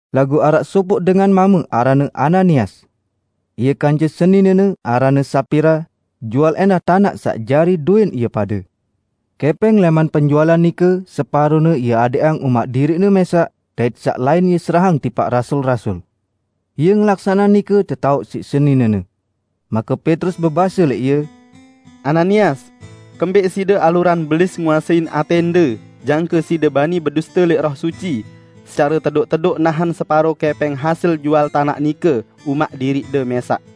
Laguq araq sopoq dengan mame aranne Ananias. Ie kance seninene aranne Sapira, jual ẽndah tanaq saq jari dowẽn ie pade. Kẽpẽng lẽman penjualan nike separone ie adẽqang umaq diriqne mẽsaq dait saq lain ie serahang tipaq rasul-rasul. Ie ngelaksaneang nike tetaoq siq seninene. Make Petrus bebase lẽq ie, "Ananias, kembẽq side alurang Belis nguasein atẽnde, jangke side bani beduste lẽq Roh Suci, secare tedoq-tedoq nahen separo kẽpẽng hasil jual tanaq nike umaq diriqde mẽsaq?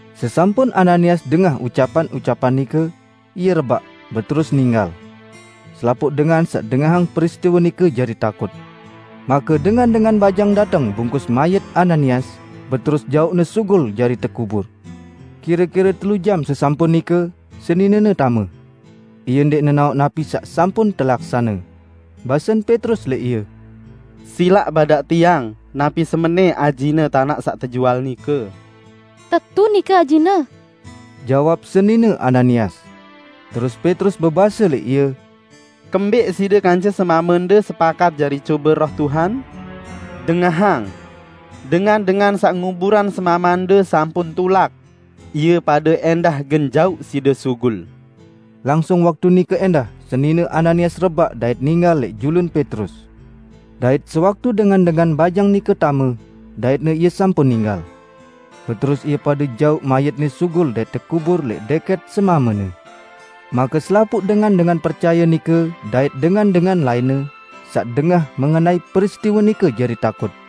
Sesampun Ananias dengah ucapan-ucapan nike, ie rebaq, beterus ninggal. Selapuq dengan saq dengahang peristiwe nike jari takut. Make dengan-dengan bajang dateng bungkus mayit Ananias, beterus jauqne sugul jari tekubur. Kire-kire telu jam sesampun nike, seninene tame. Ie ndẽq nenaoq napi saq sampun telaksane. Basen Petrus lẽq ie, "Silaq badaq tiang, napi semenẽ ajine tanaq saq tejual nike?" "Tetu, nike ajine," jawab senine Ananias. Terus Petrus bebase lẽq ie, "Kembẽq side kance semamende sepakat jari cobe Roh Tuhan? Dengahang! Dengan-dengan saq nguburang semamende sampun tulak. Ie pade ẽndah gen jauq side sugul." Langsung waktu nike ẽndah senine Ananias rebaq dait ninggal lẽq julun Petrus. Dait sewaktu dengan-dengan bajang nike tame, daitne ie sampun ninggal. Beterus ie pade jauq mayitne sugul dait tekubur lẽq dẽkẽt semamene. Make selapuq dengan-dengan percaye nike dait dengan-dengan lainne, saq dengah mengenai peristiwe nike jari takut.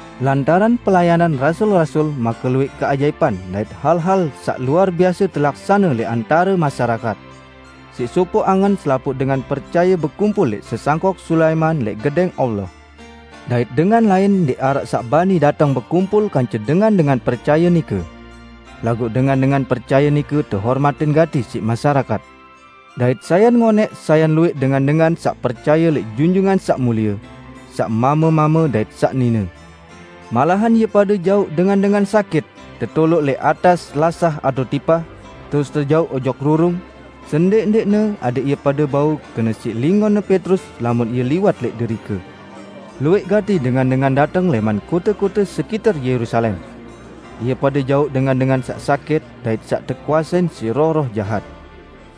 Lantaran pelayanan rasul-rasul make luwẽq keajaipan dait hal-hal saq luar biase telaksane lẽq antare masyarakat. Siq sopoq angen selapuq dengan percaye bekumpul lẽq Sesangkok Sulaiman lẽq Gedẽng Allah. Dait dengan lain ndẽq araq saq bani dateng bekumpul kance dengan-dengan percaye nike. Laguq dengan-dengan percaye nike tehormatin gati siq masyarakat. Dait sayan ngonẽq sayan luwẽq dengan-dengan saq percaye lẽq Junjungan Saq Mulie -- saq mame-mame dait saq nine. Malahan ie pade jauq dengan-dengan sakit tetoloq lẽq atas lasah atao tipah, terus tejauq ojok rurung, sendẽq-ndẽqne adẽq ie pade bau kene siq lingonne Petrus lamun ie liwat lẽq derike. Luwẽq gati dengan-dengan dateng lẽman kote-kote sekiter Yerusalem. Ie pade jauq dengan-dengan saq sakit dait saq tekuasein siq roh-roh jahat.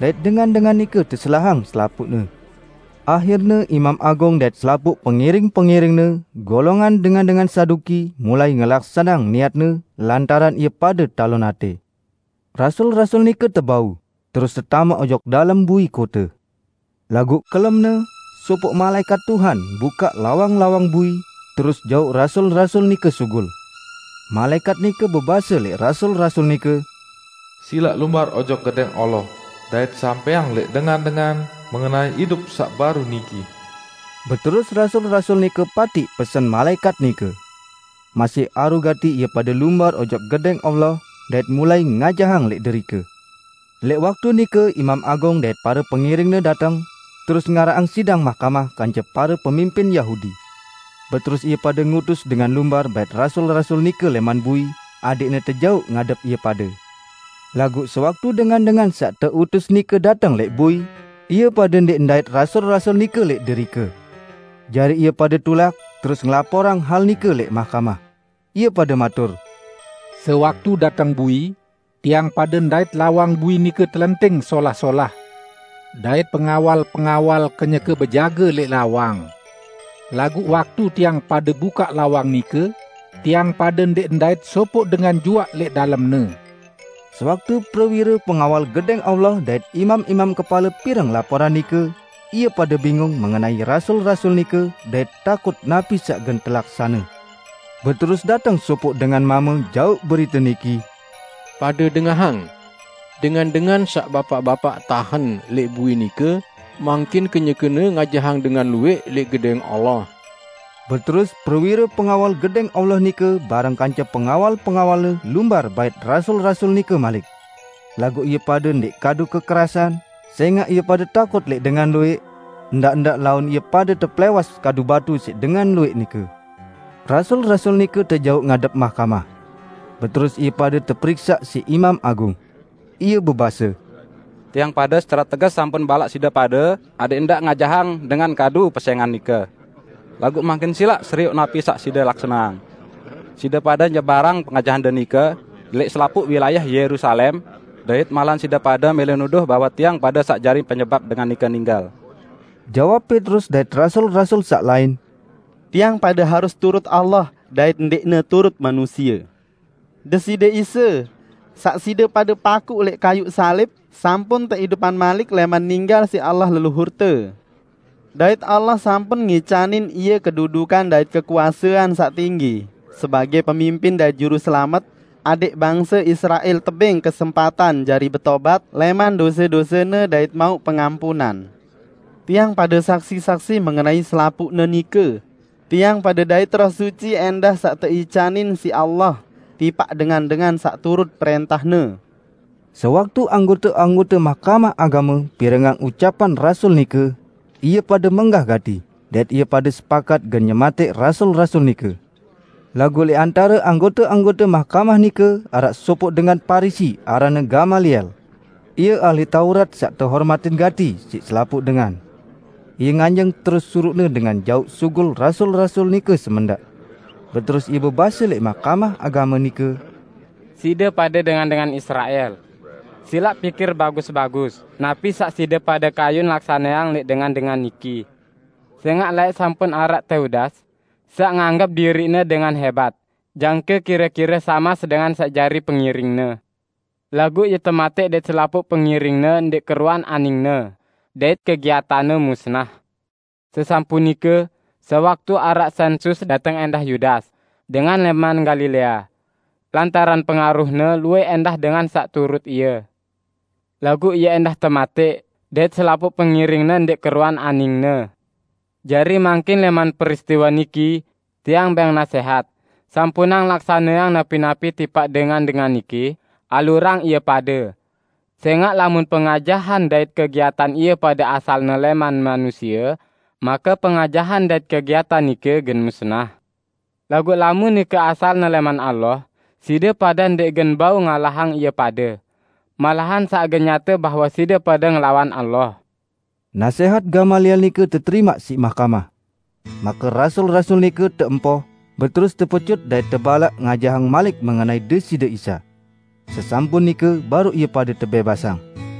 Dait dengan-dengan nike teselahang selapuqne. Ahirne Imam Agung dait selapuq pengiring-pengiringne, golongan dengan-dengan Saduki, mulai ngelaksaneang niatne lantaran ie pade talon atẽ. Rasul-rasul nike tebau, terus tetamaq ojok dalem bui kote. Laguq kelemne, sopoq malaẽkat Tuhan bukaq lawang-lawang bui, terus jauq rasul-rasul nike sugul. Malaẽkat nike bebase lẽq rasul-rasul nike, "Silaq lumbar ojok Gedẽng Allah dait sampẽang lẽq dengan-dengan mengenai idup saq baru niki." Beterus rasul-rasul nike patiq pesen malaẽkat nike. Masih aru gati ie pade lumbar ojok Gedẽng Allah, dait mulai ngajahang lẽq derike. Lẽq waktu nike Imam Agung dait pare pengiringne dateng, terus ngaraqang sidang mahkamah kance pare pemimpin Yahudi. Beterus ie pade ngutus dengan lumbar bait rasul-rasul nike lẽman bui adẽqne tejauq ngadep ie pade. Laguq sewaktu dengan-dengan saq teutus nike dateng lẽq bui, ie pade ndẽq ndait rasul-rasul nike lẽq derike. Jari ie pade tulak, terus ngelaporang hal nike lẽq mahkamah. Ie pade matur, "Sewaktu dateng bui, tiang pade ndait lawang bui nike telenting solah-solah, dait pengawal-pengawal kenyeke bejage lẽq lawang. Laguq waktu tiang pade bukaq lawang nike, tiang pade ndẽq ndait sopoq dengan juaq lẽq dalemne." Sewaktu prewire pengawal Gedẽng Allah dait imam-imam kepale pireng laporan nike, ie pade bingung mengenai rasul-rasul nike, dait takut napi saq gen telaksane. Beterus dateng sopoq dengan mame jauq berite niki, "Pade dengahang! Dengan-dengan saq bapaq-bapaq tahen lẽq bui nike mangkin kenyekene ngajahang dengan luwẽq lẽq Gedẽng Allah!" Beterus prewire pengawal Gedẽng Allah nike bareng kance pengawal-pengawalne lumbar bait rasul-rasul nike malik. Laguq ie pade ndẽq kadu kekerasan, sẽngaq ie pade takut lẽq dengan luwẽq; ndaq-ndaq laun ie pade tepelẽwas kadu batu siq dengan luwẽq nike. Rasul-rasul nike tejauq ngadep mahkamah. Beterus ie pade teperiksaq siq Imam Agung. Ie bebase, "Tiang pade secare teges sampun balaq side pade adẽq ndaq ngajahang dengan kadu pesẽngan nike. Laguq mangkin silaq serioq napi saq side laksaneang! Side pade nyebarang pengajahande nike lẽq selapuq wilayah Yerusalem, dait malahan side pade mẽlẽ nuduh bahwe tiang pade saq jari penyebap Dengan nike ninggal." Jawab Petrus dait rasul-rasul saq lain, "Tiang pade harus turut Allah dait ndẽqne turut manusie. Deside Isa, saq side pade pakuq lẽq kayuq salib, sampun teidupang malik lẽman ninggal siq Allah leluhurte. Dait Allah sampun ngicanin Ie kedudukan dait kekuasean saq tinggi sebagẽ Pemimpin dait Juruselamet; adẽq bangse Israel tebẽng kesempatan jari betobat lẽman dose-dosene dait mauq pengampunan. Tiang pade saksi-saksi mengenai selapuqne nike -- tiang pade dait Roh Suci ẽndah saq teicanin siq Allah tipaq dengan-dengan saq turut prẽntah-Ne." Sewaktu anggote-anggote Mahkamah Agame pirengang ucapan rasul nike, ie pade menggah gati, dait ie pade sepakat gen nyematẽq rasul-rasul nike. Laguq lẽq antare anggote-anggote mahkamah nike araq sopoq dengan Parisi aranne Gamaliel. Ie ahli Taurat saq tehormatin gati siq selapuq dengan. Ie nganjeng terus suruqne dengan jauq sugul rasul-rasul nike semendaq. Beterus ie bebase lẽq Mahkamah Agame nike, "Side pade dengan-dengan Israel! Silaq pikir bagus-bagus napi saq side pade kayun laksaneang lẽq dengan-dengan niki. Sẽngaq laẽq sampun araq Teudas, saq nganggep diriqne dengan hẽbat, jangke kire-kire samas dengan saq jari pengiringne. Laguq ie tematẽq dait selapuq pengiringne ndẽq keruan aningne, dait kegiatanne musnah. Sesampun nike, sewaktu araq sẽnsus, muncul ẽndah Yudas, dengan lẽman Galilea. Lantaran pengaruhne, luwẽq ẽndah dengan saq turut ie. Laguq ie ẽndah tematẽq, dait selapuq pengiringne ndẽq keruan aningne. Jari mangkin lẽman peristiwe niki, tiang bẽng nasẽhat: Sampunang laksaneang napi-napi tipaq dengan-dengan niki, alurang ie pade. Sẽngaq lamun pengajahan dait kegiatan ie pade asalne lẽman manusie, make pengajahan dait kegiatan nike gen musnah. Laguq lamun nike asalne lẽman Allah, side pade ndẽq gen bau ngalahang ie pade. Malahan sang gen nyate bahwe side pade ngelawan Allah." Nasẽhat Gamaliel nike teterimaq siq mahkamah. Make rasul-rasul nike tempoh, beterus tepecut dait tebalaq ngajahang malik mengenai Deside Isa. Sesampun nike, baruq ie pade tebẽbasang.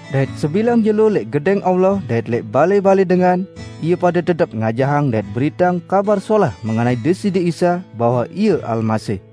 Dait sebilang jelo lẽq Gedẽng Allah dait lẽq balẽ-balẽ dengan, ie pade tetep ngajahang dait beriteang Kabar Solah mengenai Deside Isa, bahwe Ie Almasih.